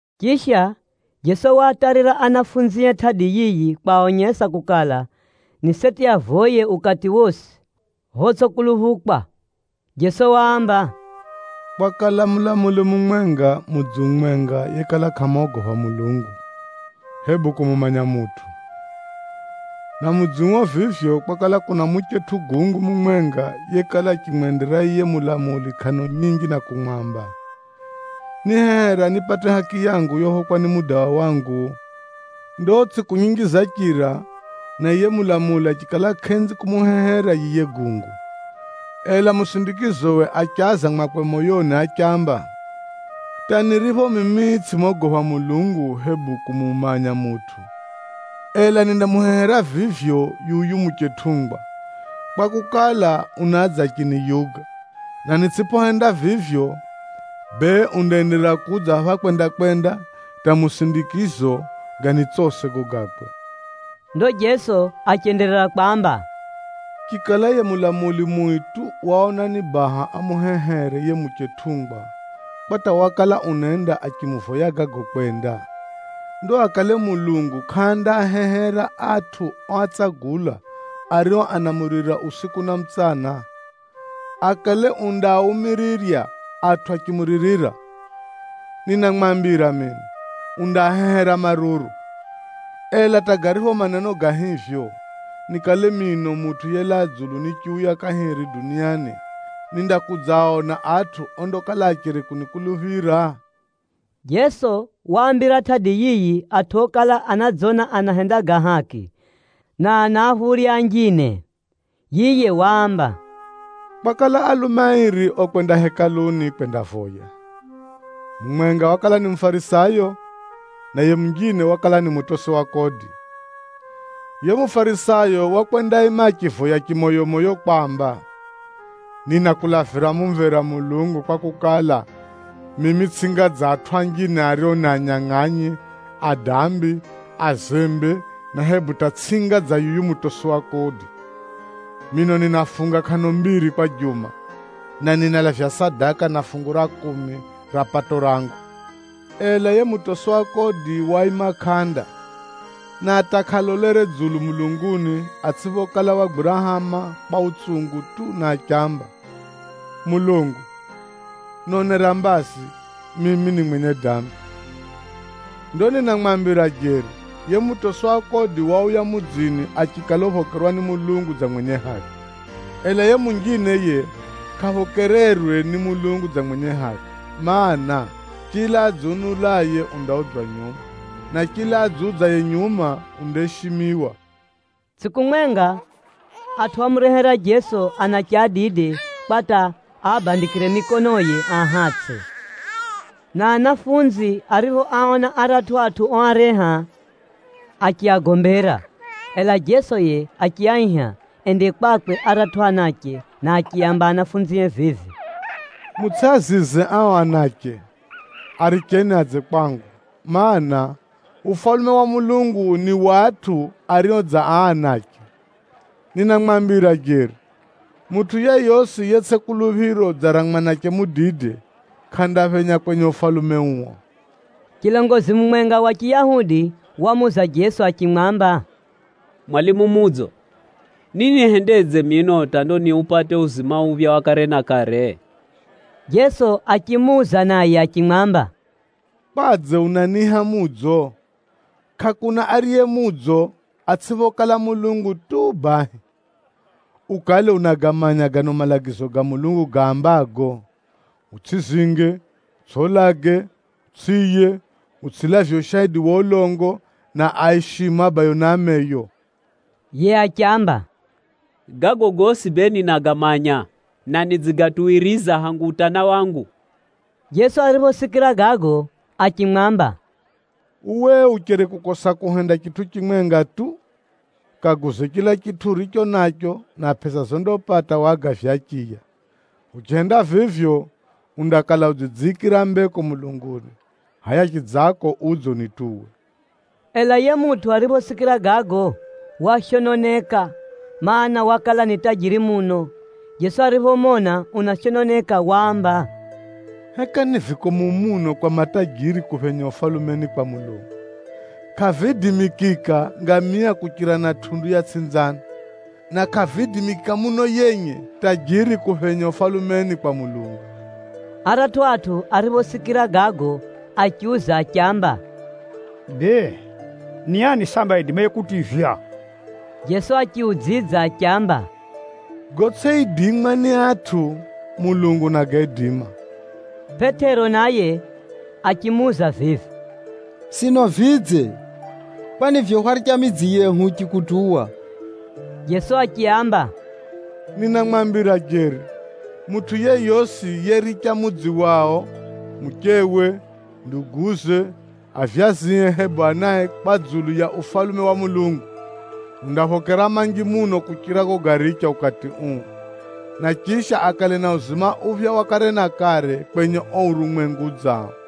Chisha, Jeso waatarira ahumwae tʼadi yiyi kwaonyesa kukala, ni seti avoye ukati wosi photsʼikuluphukwa. Jeso waamba, “Kwakala mulamuli mumwenga mudzi umwenga yekala kʼamogopha Mulungu, hebu kumumanya mutʼu. Na mudzi uo vivyo, kwakala kuna muchetʼu gungu mumwenga yekala achimwendera yiye mulamuli kʼano nyinji na kumwamba, ‘Nihehera nipate haki yangu yophokwa ni mudawa wangu.’ Ndo tsʼiku nyinji zachira na yiye mulamuli achikala kʼenzi kumuhehera yiye gungu. Ela musindikizowe achaza mwakwe moyoni achiamba, ‘Hata niripho mimi tsʼimogopha Mulungu hebu kumumanya mutʼu, ela nindamuhehera vivyo yuyu muchetʼungwa, kwakukala, unadza achiniyuga, na nitsʼiphohenda vivyo, bee undaenderera kudza phapha kwenda-kwenda hata musindikizo ganitsose gago gakwe!’” Ndo Jeso achenderera kwamba, “Chikala yiye mulamuli mui tu waona ni baha amuhehere yiye muchetʼungwa kwa hata wakala unenda achimuvoya gago kwenda, ndo akale Mulungu kʼandaahehera atʼu oatsagula, ario anamuririra usiku na mutsana? Akale undaaumirirya atʼu achimuririra? Ninamwambira mino, undaahehera maruru. Ela hata garipho maneno ga hivyo, nikale mino Mutʼu yelaa dzulu nichiuya kahiri duniani, nindakudzaona atʼu ondakala acheri kunikuluphira?” Jeso waambira tʼadi yiyi atʼu okala anadzona anahenda ga haki, na anaaphurya anjine. Yiye waamba, “Kwakala alume airi okwenda Hekaluni kwendavoya. Mumwenga wakala ni Mufarisayo, na yiye munjine wakala ni mutosi wa kodi. “Yiye Mufarisayo wakwendaima achivoya chimoyomoyo kwamba, ‘Ninakulavira mumvera Mulungu, kwakukala, mimi tsʼinga dza atʼu anjine ario ni anyangʼanyi, adambi, azembe, na hebu hata tsʼinga dza yuyu mutosi wa kodi. Mino ninafunga kʼano mbiri kwa juma, na ninalavya sadaka na fungu ra kumi ra pato rangu.’ “Ela yiye mutosi wa kodi waima kʼanda, na hata kʼalolere dzulu mulunguni atsʼiphokala wagwira hama kwa utsungu tu na achiamba, ‘Mulungu, nonera mbazi, mimi ni mwenye dambi.’ “Ndo ninamwambira jeri, yiye mutosi wa kodi wauya mudzini achikala uphokerwa ni Mulungu dza mwenye haki. Ela yiye munjine yiye kʼaphokererwe ni Mulungu dza mwenye haki, mana, chila adziunulaye undaudzwa nyuma, na adziudzaye nyuma undaishimiwa.” Tsʼiku mwenga, atʼu ámurehera Jeso anache adide kwa hata aabandikire mikonoye aahatsʼe, na ahumwa ariphoaona aratʼu atʼu oareha, achiagombera. Ela Jeso yiye achiaiha ende kwakwe aratʼu anache na achiaamba ao ahumwae vivi, “Mutsʼiazize ao anache, aricheni adze kwangu, mana, Ufalume wa Mulungu ni wa atʼu ario dza aa anache. Ninamwambira jeri, mutʼu yeyosi yetsʼi kuluphiro dza ra mwanache mudide, kʼandaphenya kwenye Ufalume uo.” Chilongozi mumwenga wa Chiyahudi wamuuza Jeso achimwamba, “Mwalimu mudzo, ninihendedze mino hata ndo niupate uo uzima uphya wa kare na kare?” Jeso achimuuza naye achimwamba, “Kwadze unaniiha mudzo? Kʼakuna ariye mudzo, atsʼiphokala Mulungu tu bahi. Ukale unagamanya gano malagizo ga Mulungu gaambago, ‘Utsʼizinge, utsʼiulage, utsʼiiye, utsʼilavye ushaidi wa ulongo, na aishime abayo na ameyo’?” Yiye achiamba, “Gago gosi bee ninagamanya, na nidzigatuwiriza hangu utana wangu.” Jeso ariphosikira gago achimwamba, “Uwe ucheri kukosa kuhenda chitʼu chimwenga tu. Kaguze chila chitʼu uricho nacho na pʼesa zondapata wagavye achiya. Uchihenda vivyo, undakala udzidziikira mbeko mulunguni, hʼaya chidzako udze unituwe.” Ela yiye mutʼu ariphosikira gago, washononeka, mana, wakala ni tajiri muno. Jeso ariphomona unashononeka, waamba, “Heka ni vikomu muno kwa matajiri kuphenya Ufalumeni kwa Mulungu! Kʼaviidimikika ngamia kuchira na tʼundu ya tsʼinzano, na kʼaviidimikika muno yenye tajiri kuphenya Ufalumeni kwa Mulungu.” Aratʼu atʼu ariphosikira gago achiuza achiamba, “Bee, ni ani sambi aidimaye kutivywa?” Jeso achiudzidza achiamba, “Gotsʼiidimwa ni atʼu, Mulungu unagaidima.” Pʼetero naye achimuuza vivi, “Sino vidze? Kwani vivyo hwaricha midzi yehu huchikutuwa!” Jeso achiaamba, “Ninamwambira jeri, mutʼu yeyosi yericha mudzi wao, muchewe, nduguze, avyazie hebu anae kwa dzulu ya Ufalume wa Mulungu, undaphokera manji muno kuchira gogaricha ukati uu, na chisha akale na uzima uphya wa kare na kare kwenye uo urumwengu udzao.”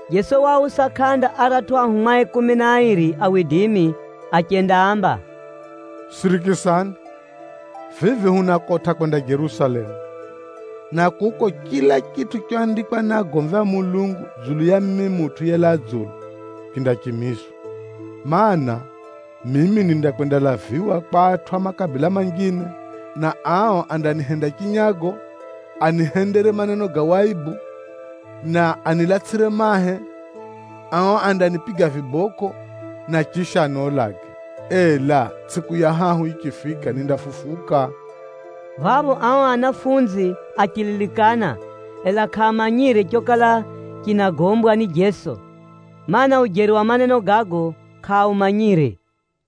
Jeso waausa kʼanda aratʼu ahumwae kumi na airi achendaamba, “Sirikisani! Vivi hunakotʼa kwenda Jerusalemu, na kuko chila chitʼu choandikwa ni agomvi a Mulungu dzulu ya mimi Mutʼu yelaa dzulu, chindachimizwa. Maana, mimi nindakwendalaviwa kwa atʼu a makabila manjine, na ao andanihenda chinyago, anihendere maneno ga waibu, na anilatsʼire mahe. Ao andanipiga vibokʼo, na chisha aniulage, ela tsʼiku ya hahu yichifika, nindafufuka.” Phapho ao ahumwa achililikana, ela kʼaamanyire chokala chinagombwa ni Jeso, mana, ujeri wa maneno gago kʼaaumanyire.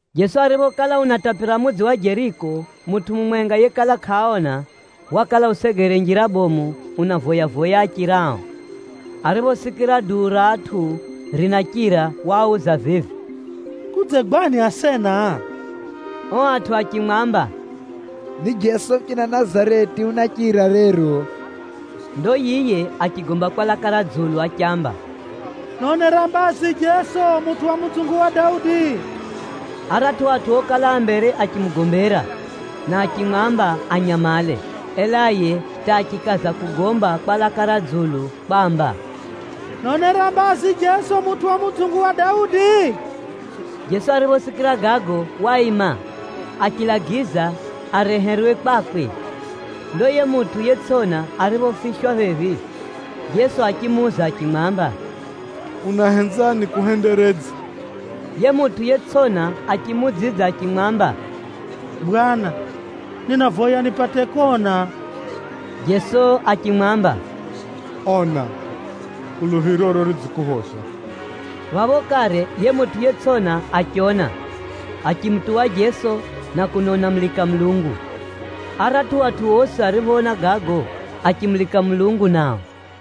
Jeso ariphokala unatapira mudzi wa Jeriko, mutʼu mumwenga yekala kʼaona, wakala usegere njira bomu unavoya-voya achirao. Ariphosikira duu ra atʼu rinachira, wauza vivi, “Kudzegwani asena?” Ao atʼu achimwamba, “Ni Jeso muchina Nazareti unachira rero.” Ndo yiye achigomba kwa laka ra dzulu achiamba, “Nonera mbazi Jeso mutʼu wa mudzungu wa Daudi!” Aratʼu atʼu okala a mbere achimugombera na achimwamba anyamale, ela yiye hata achikaza kugomba kwa laka ra dzulu kwamba, “Nonera mbazi Jeso mutʼu wa mudzungu wa Daudi!” Jeso ariphosikira gago waima, achilagiza areherwe kwakwe. Ndo yiye mutʼu yetsʼona ariphofiswa phephi, Jeso achimuuza achimwamba, “Unahenza nikuhenderedze?” Yiye mutʼu yetsʼona achimuudzidza achimwamba, “Bwana, ninavoya nipate kona.” Jeso achimwamba, “Ona! Kuluphiroro ridzikuphoza.” Phapho kare yiye mutʼu yetsʼona achiona, achimutuwa Jeso na kuno unamulika Mulungu. Aratʼu atʼu osi ariphoona gago, achimulika Mulungu nao.